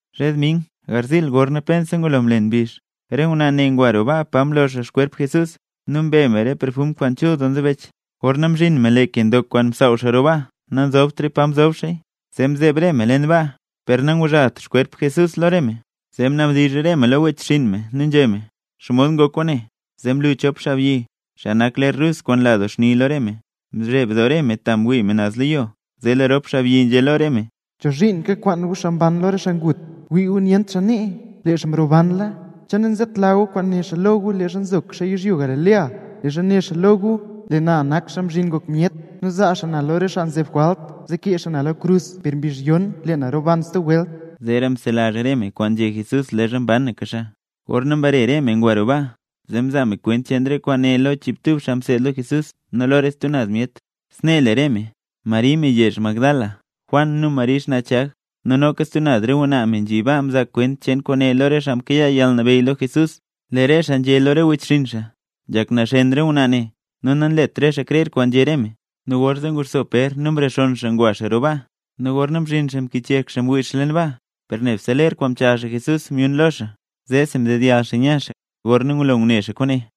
Zhe dming garziil gorna pensa ngulo mlen mbizh, re ngwnaa ne ngwa roo baa pa mlo xaa xkwerp Jesús, nu mbe me re perfum kwaan chul doo nzebech. Gorna mzhin me lee ke ndok kwaan msaaw xaa roo baa nanzobtra pa mzob xaaya. Zee mzeeb re me leen baa per nanguzhalt xkwerp Jesús lo re me. Zee mnabdizh re me lo wechxinn me nu nzhé me: —¿Xomod ngok kwaane? Zee mlu chop xaabyi, xaa nak ler rus kwaan nla xni doo lo re me. Mzheb doo re me ta mwii re me naz lo yo. Zee lee rop xaabyi zee nzhé lo re me: —¿Chozhiin kakwaan gu xaa mban lo re xaa ngut? Wii gu nyent xaa nee; lee xaa mrobanla. ¿Che nanzetla gu kwaan né xaa lo gu leezha nzoka xaa yizhyo Galilea? Leezha né xaa lo gu: “Lee na nak Xaa Mzhin Ngok Myet, nu zaa xaa na lo re myet xaa nzeb jwalt, zee kee re xaa na lo krus per lee mbizh yon lee na roban stub welt”. Zeera mzelazh re me kwaan nzhé Jesús leezha mbanaka xaa. Gorna mbare re me ngwa me roo baa, zee mzaa me kwent cheen re kwaane lo chiibtub xaa mseed lo Jesús nu lo re stub naz myet. Snee le re me: Mari me yezh Magdala, Juan, nu Mari xnaa Chag. Nu noka stub naz re ngwnaa me nzhi baa mzaa kwent cheen kwaane lo re xaa mkayaa yalnabeyy lo Jesús. Lee re xaa nzhé lo re wechxinn xaa: —¡Nzhak naxen re ngwnaa ne! Nu nanlet re xaa krer kwaan nzhé re me. Nu gorzee nguxso Pér nu mrexonn xaa ngwa xaa roo baa. Nu gorna mzhin xaa mkichyek xaa mwii xaa leen baa per nebse ler kwaan mchaal xaa Jesús myun lo xaa. Zeesi mdedyall xaa nya xaa, gorna ngulo ngune xaa kwaane.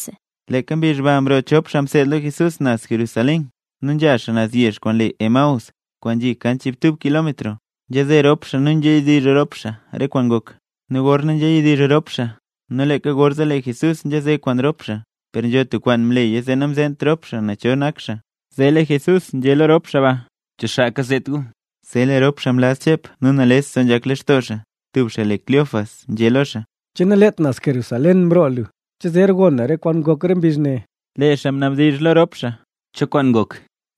Leeka mbizh ba mroo chop xaa mseed lo Jesús naz Jerusalén nu nzha xaa yezh kwaan le Emaús, kwaan nzhi kan chiibtub kilómetro. Nzhaze rop xaa nu nzhayadizh rop xaa re kwaan ngok. Nu gorna nzhayadizh rop xaa nu leeka gorzee lee Jesús nzhaze kwaan rop xaa, per nzho tub kwaan mleya zee namzeent rop xaa cho xaa nak xaa. Zee lee Jesús nzhé lo rop xaa ba: —¿Cho xaa kazet gu? Zee lee rop xaa mlaz chep nu nales doo nzhak lextoo rop xaa. Tub xaa le Cleofas nzhé lo xaa: —¿Che naleet naz Jerusalén mroo lu? ¿Che zer gon lu re kwaan ngok re mbizh ne? Lee xaa mnabdizh lo rop xaa: —¿Cho kwaan ngok?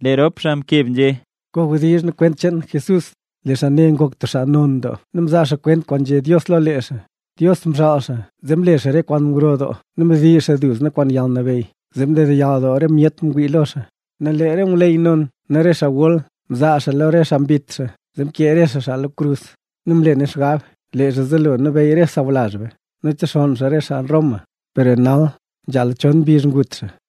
Lee rop xaa mkeb nzhé: —Kawdizhno nu kwent cheen Jesús xaa yezh Nazaret. Lee xaa ne ngok tub xaa non doo nu mzaa xaa kwent kwaan nzhé Dios lo lee xaa. Dios mxaal xaa zee mle xaa re kwaan gro doo nu mdiizh xaa duzna kwaan yalnabeyy zee mdedyall doo re myet mwii lo xaa. Nu lee re ngwleyy non nu re xaa gol mzaa xaa lo re xaa mbit xaa, zee mkee re xaa xaa lo krus. Nu mle nu xgab lee xaa zelo nabeyy re sawlazh be, nu texonn xaa re xaa Roma, per lee nal nzhala chon mbizh ngut xaa.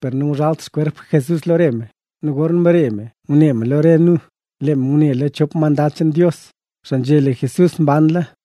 per nanguzhalt xkwerp Jesús lo re me! Nu gorna mbare re me lo re nu, ngune me lo re nu, lee me ngune lo chop mandad cheen Dios, xaa nzhé lo re me lee Jesús mbanla.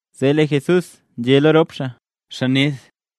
Zee lee Jesús nzhé lo rop xaa: —¡Xaa ned!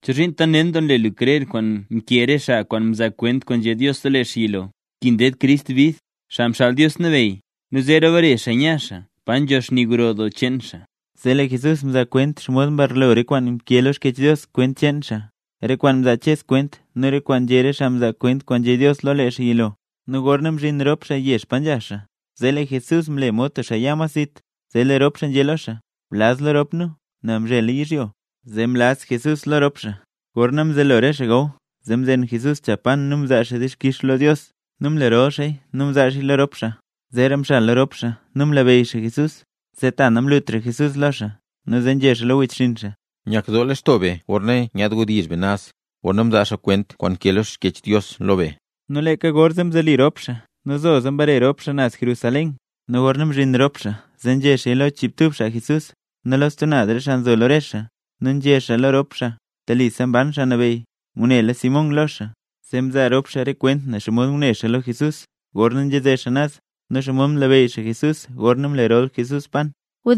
¿Chozhiin tant nen doo nle gu krer kwaan mkee re xaa kwaan mzaa kwent kwaan nzhé Dios lo lee xaa yilo? Nkin ded Crist bid, Xaa Xaal Dios Nabeyy, nu zeera bare xaa nya xaa pa nzho xni gro doo cheen xaa. Zee lee Jesús mzaa kwent xomod mbarlo re kwaan nkee lo Xkyech Dios cheen lee xaa, re kwaan mzaa Ches kwent nu re kwaan nzhé re xaa mzaa kwent kwaan nzhé Dios lo lee xaa yilo. Nu gorna mzhin rop xaa yezh pa nzha xaa, zee lee Jesús mle mod tub xaa ya mas zit, zee lee rop xaa nzhé lo xaa: —Blaz lo rop nu, nel mzhela yizhyo. Zee mlaz Jesús lo rop xaa. Gorna mzelo re xaa gaw, zee mzen Jesús cha pan nu mzaa xaa dixkix lo Dios nu mlerol xaaya, nu mzaa xaaya lo rop xaa. Zeera mxal lo rop xaa, nu mlabeyy xaa Jesús. Zee ta namlutra Jesús lo xaa. Nu zee nzhé xaa lo wechxinn xaa: —¡Nyak doo lextoo be gorna nyaad wdizh be naz, gorna mzaa xaa kwent kwaan nkee lo Xkyech Dios lo be! Nu leeka gorzee mzoli rop xaa nu zoza mbare rop xaa naz Jerusalén. Nu gorna mzhin rop xaa zee nzhé xaaya lo chiibtub xaa Jesús, nu lo stub naz re xaa nzo lo re xaa. Nu nzhé re xaa lo rop xaa: —Telisa mban Xaa Nabeyy, ngunela Pér lo xaa. Zee mzaa rop xaa re kwent ne xomod ngune xaa lo Jesús gorna nzhaze xaa naz, nu xomod mlabeyy xaa Jesús gorna mlerol Jesús pan.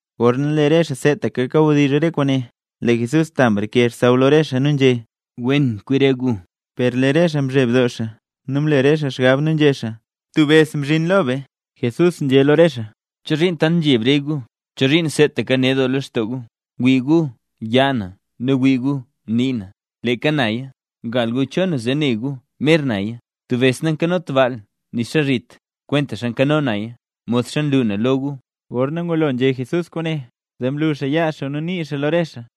Gorna lee re xaa seetaka kawdizh re kwaane, lee Jesús ta mreke xsaww lo re xaa nu nzhé: —Wen kwi re gu. Per lee re xaa mzheb doo, nu mle re xaa xgab nu nzhé xaa: —Tub bes mzhin lo be. Jesús nzhé lo re xaa: —¿Chozhiin tant nzheb re gu? ¿Chozhiin seetaka ned doo lextoo gu? Wii gu yaa na nu wii gu nii na. ¡Leeka naya! Gal gu cho na zee ne gu mer naya. Tub bes nankanot baal nixa zhit, kwentaxa nkano naya, modxa nlu na lo gu. Gorna ngulo nzhé Jesús kwaane, zee mlu xaa yaa xaa nu nii xaa lo re xaa.